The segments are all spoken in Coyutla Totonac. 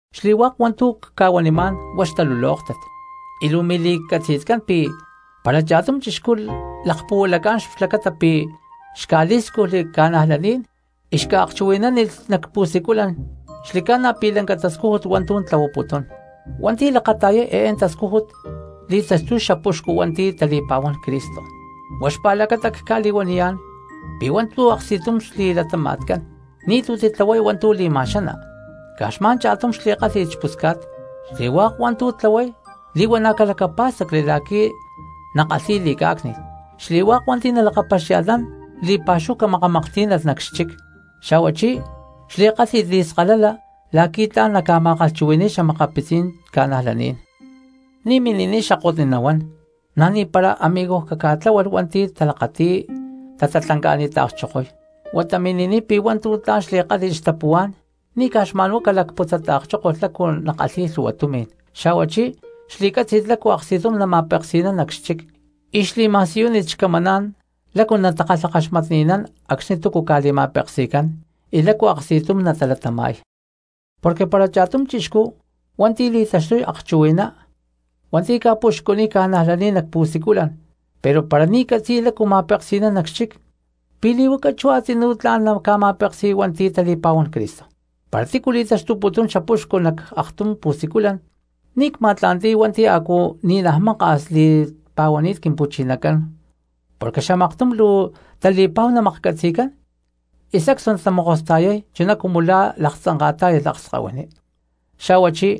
Xli̠hua̠k hua̠ntu̠ cca̠huanimá̠n huá xtalulóktat, y luu mili̠catzi̠tcán pi̠ para cha̠tum chixcú lakpuhualacá̠n xlacata pi̠ xca̠lí̠scujli xta̠cristianos y xca̠akchuhui̠nánilh nac pu̠siculan, xli̠ca̠na pi̠ lanca tascújut hua̠ntu̠ tlahuaputún. Xli̠ca̠na pi̠ hua̠nti̠ lakata̠yay eé tascújut li̠taxtuy xapuxcu hua̠nti̠ tali̠pa̠huán Cristo, huá xpa̠lacata cca̠li̠huaniyá̠n pi̠ hua̠ntu̠ aksti̠tum xli̠latama̠tcán, ni̠tu̠ titlahuay hua̠ntu̠ li̠ma̠xana, caj xma̠n cha̠tum xli̠kálhi̠t xpusca̠t, xli̠hua̠k hua̠ntu̠ tlahuay li̠huana̠ calacapá̠stacli la̠qui̠ nakalhi̠y li̠cá̠cni̠t, xli̠hua̠k hua̠nti̠ nalakapaxia̠lhnán li̠pa̠xúhu camakamaklhtí̠nalh nac xchic, xa̠huachí xli̠kálhi̠t li̠skalala la̠qui̠ tla̠n naca̠ma̠kalhchuhui̠ni̠y xa̠makapitzí̠n cristianos. Ni̠ mini̠niy xakotni nahuán, na̠ ni̠para amigoj caca̠tá̠lalh hua̠nti̠ talakati̠y tatatlanca̠ni̠ta̠kchokoy, huata mini̠niy pi̠ hua̠ntu̠ tla̠n xli̠kálhi̠t xtapuhuá̠n, ni̠ caj xma̠nhuá calacputzata̠kchókolh lácu nakalhi̠y lhu̠hua tumi̠n. Xa̠huachí xli̠cátzi̠t lácu aksti̠tum nama̠peksi̠nán nac xchic, y xli̠ma̠siyúnit xcamaná̠n lácu natakalhakaxmatni̠nán acxni̠ túcu ca̠li̠ma̠peksi̠cán y lácu aksti̠tum natalatama̠y. Porque para cha̠tum chixcú hua̠nti̠ li̠taxtuy akchuhui̠ná hua̠nti̠ ca̠puxcuniy cristianos nac pu̠siculan pero para ni̠ catzi̠y lácu nama̠peksi̠nán nac xchic, ¿pi̠ li̠huaca chú a̠tzinú tla̠n naca̠ma̠peksi̠y hua̠nti̠ tali̠pa̠huán Cristo? Para tícu li̠taxtuputún xapuxcu nac aktum pu̠siculan, ni̠ huá cma̠tla̠nti̠y hua̠nti̠ a̠cu ni̠naj maka̠s li̠pa̠huani̠t Quimpu̠chinacán porque xamaktum luu tali̠pa̠hu namaklhcatzi̠cán y sacstu natamokosta̠yay chuná cumu laktzanka̠tá̠yalh akskahuiní. Xa̠huachí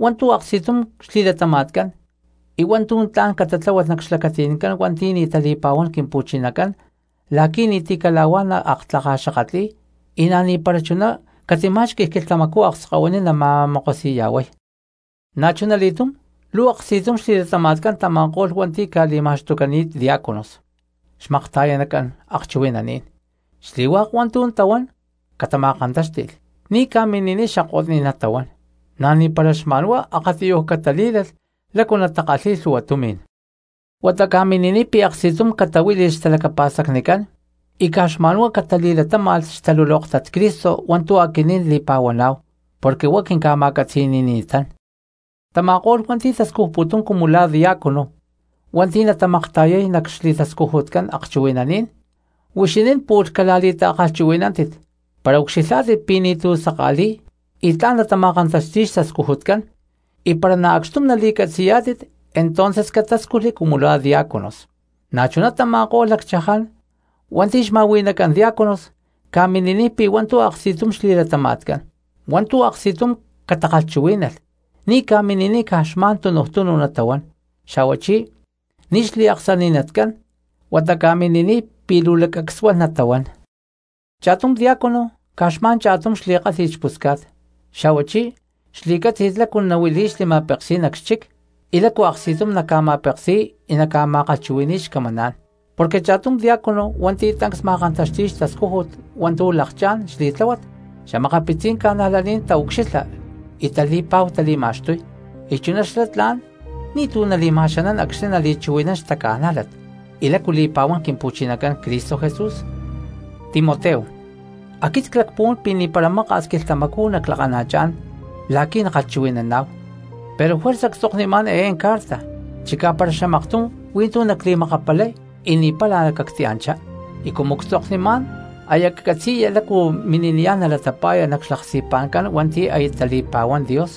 hua̠ntu̠ aksti̠tum xli̠latama̠tcán y hua̠ntu̠ tla̠n catláhualh nac xlacati̠ncán hua̠nti̠ ni̠ tali̠pa̠huán Quimpu̠chinacán la̠qui̠ ni̠ti̠ cala̠huá naaktlakaxakatli̠y y na̠ ni̠para chuná catimá̠xqui̠lh quilhtamacú akskahuiní nama̠mokosi̠ya̠huay. Na̠chunali̠túm luu aksti̠tum xli̠latama̠tcán tama̠ko̠lh hua̠nti̠ ca̠li̠ma̠xtucani̠t diácanos xmakta̠yanacán akchuhui̠naní̠n, xli̠hua̠k hua̠ntu̠ tahuán catama̠kantáxti̠lh, ni̠ ca̠mini̠niy xakotní̠n natahuán, na̠ ni̠para xma̠nhuá akatiyuj catalí̠lalh lácu natakalhíy lhu̠hua tumi̠n. Huata ca̠mini̠niy pi̠ aksti̠tum catahuíli̠lh xtalacapa̠stacnicán, y caj xma̠nhuá catali̠latáma̠lh xtalulóktat Cristo hua̠ntu̠ aquinín li̠pa̠huaná̠hu, porque huá quinca̠ma̠catzi̠ni̠ni̠tán. Tama̠ko̠lh hua̠nti̠ tascujputún cumu la̠ diácono hua̠nti̠ natamakta̠yay nac xli̠tascujutcán akchuhui̠naní̠n, huixinín pu̠lh cala̠li̠ta̠kalhchuhui̠nántit, para ucxilhá̠tit pi̠ ni̠tu̠ saka̠li̠y y tla̠n natama̠kantaxti̠y xtascujutcán, y para na̠ acxtum nali̠catzi̠yá̠tit entonces catáscujli cumu la̠ diáconos. Na̠chuná tama̠ko̠lh lacchaján hua̠nti̠ xma̠hui̠nacán diáconos, ca̠mini̠niy pi̠ hua̠ntu̠ aksti̠tum xli̠latama̠tcán, hua̠ntu̠ aksti̠tum catakalhchuhuí̠nalh, ni̠ ca̠mini̠niy caj xma̠n tunuj túnu natahuán, xa̠huachí ni̠ xliaksani̠natcán, huata ca̠mini̠niy pi̠ luu laccacsuán natahuán. Cha̠tum diácono caj xma̠n cha̠tum xli̠kálhi̠t xpusca̠t, xa̠huachí xli̠cátzi̠t lácu nahuili̠y xli̠ma̠pekí̠n nac xchic, y lácu aksti̠tum naca̠ma̠peksi̠y y naca̠ma̠kalhchuhui̠ni̠y xcamaná̠n. Porque cha̠tum diácono hua̠nti̠ tancs ma̠kantaxti̠y xtascújut hua̠ntu̠ lakchá̠n xli̠tláhuat, xa̠makapitzí̠n cristianos taucxilha y tali̠pa̠hu tali̠ma̠xtuy, y chuná xlá tla̠n ni̠tu̠ nali̠ma̠xanán acxni̠ nali̠chuhui̠nán xtaca̠nájlat y lácu li̠pa̠huán Quimpu̠chinacán Cristo Jesús. Timoteo, aquit clacpuhuán pi̠ ni̠para maka̠s quilhtamacú naclakana̠chá̠n la̠qui̠ nakalhchuhui̠naná̠hu, pero juerza ctzoknimá̠n eé carta, chicá para xamaktum hui̠ntú nacli̠makapalay y ni̠para cactianchá y cumu ctzoknunimá̠n aya catzi̠ya lácu mini̠niyá̠n nalatapa̠ya nac xlaksti̠pa̠ncán hua̠nti̠ aya tali̠pa̠huán Dios,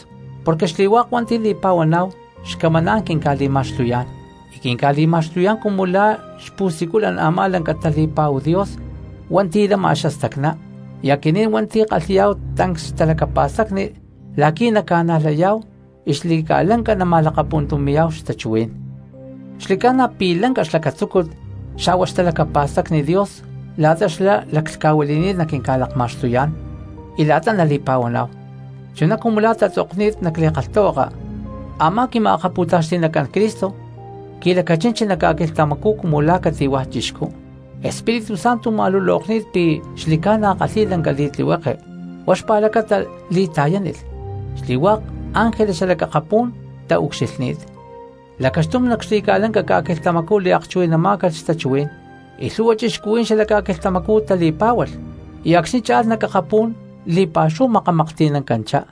porque xli̠hua̠k hua̠nti̠ li̠pa̠huaná̠hu, xcamaná̠n quinca̠li̠ma̠xtuyá̠n y quinca̠li̠ma̠xtuyá̠n cumu la̠ xpu̠siculan a̠má lanca tali̠pa̠hu Dios hua̠nti̠ lama xastacná, y aquinín hua̠nti̠ kalhi̠yá̠hu tancs xtalacapa̠stacni la̠qui̠ naca̠najlayá̠hu y xli̠ca̠lanca nama̠akpuntumi̠yá̠hu xtachuhuí̠n. Xli̠ca̠na pi̠ lanca xlacatzúcut xa̠hua xtalacapa̠stacni Dios la̠ta xlá laclhca̠huili̠ni̠t naquinca̠lakma̠xtuyá̠n y la̠ta nali̠pa̠huaná̠hu. Chuná cumu la̠ tatzokni̠t nac li̠kalhtahuaka: Amá quima̠akapu̠taxti̠nacán Cristo qui̠lacachinchi nac ca̠quilhtamacú cumu la̠ cati̠hua̠ chixcú, Espíritu Santo ma̠lulokni̠t pi̠ xli̠ca̠na kalhi̠y lanca li̠tlihueke huá xpa̠lacata li̠ta̠yánilh, xli̠hua̠k ángeles xalac akapú̠n taucxilhní̠t. Lacaxtum nac xli̠ca̠lanca ca̠quilhtamacú liakchuhui̠náncalh xtachuhuí̠n, y lhu̠hua cristianos xalac ca̠quilhtamacú tali̠pá̠hualh, y acxni̠ cha̠lh nac akapú̠n li̠pa̠xúhu makamaklhti̠nancanchá.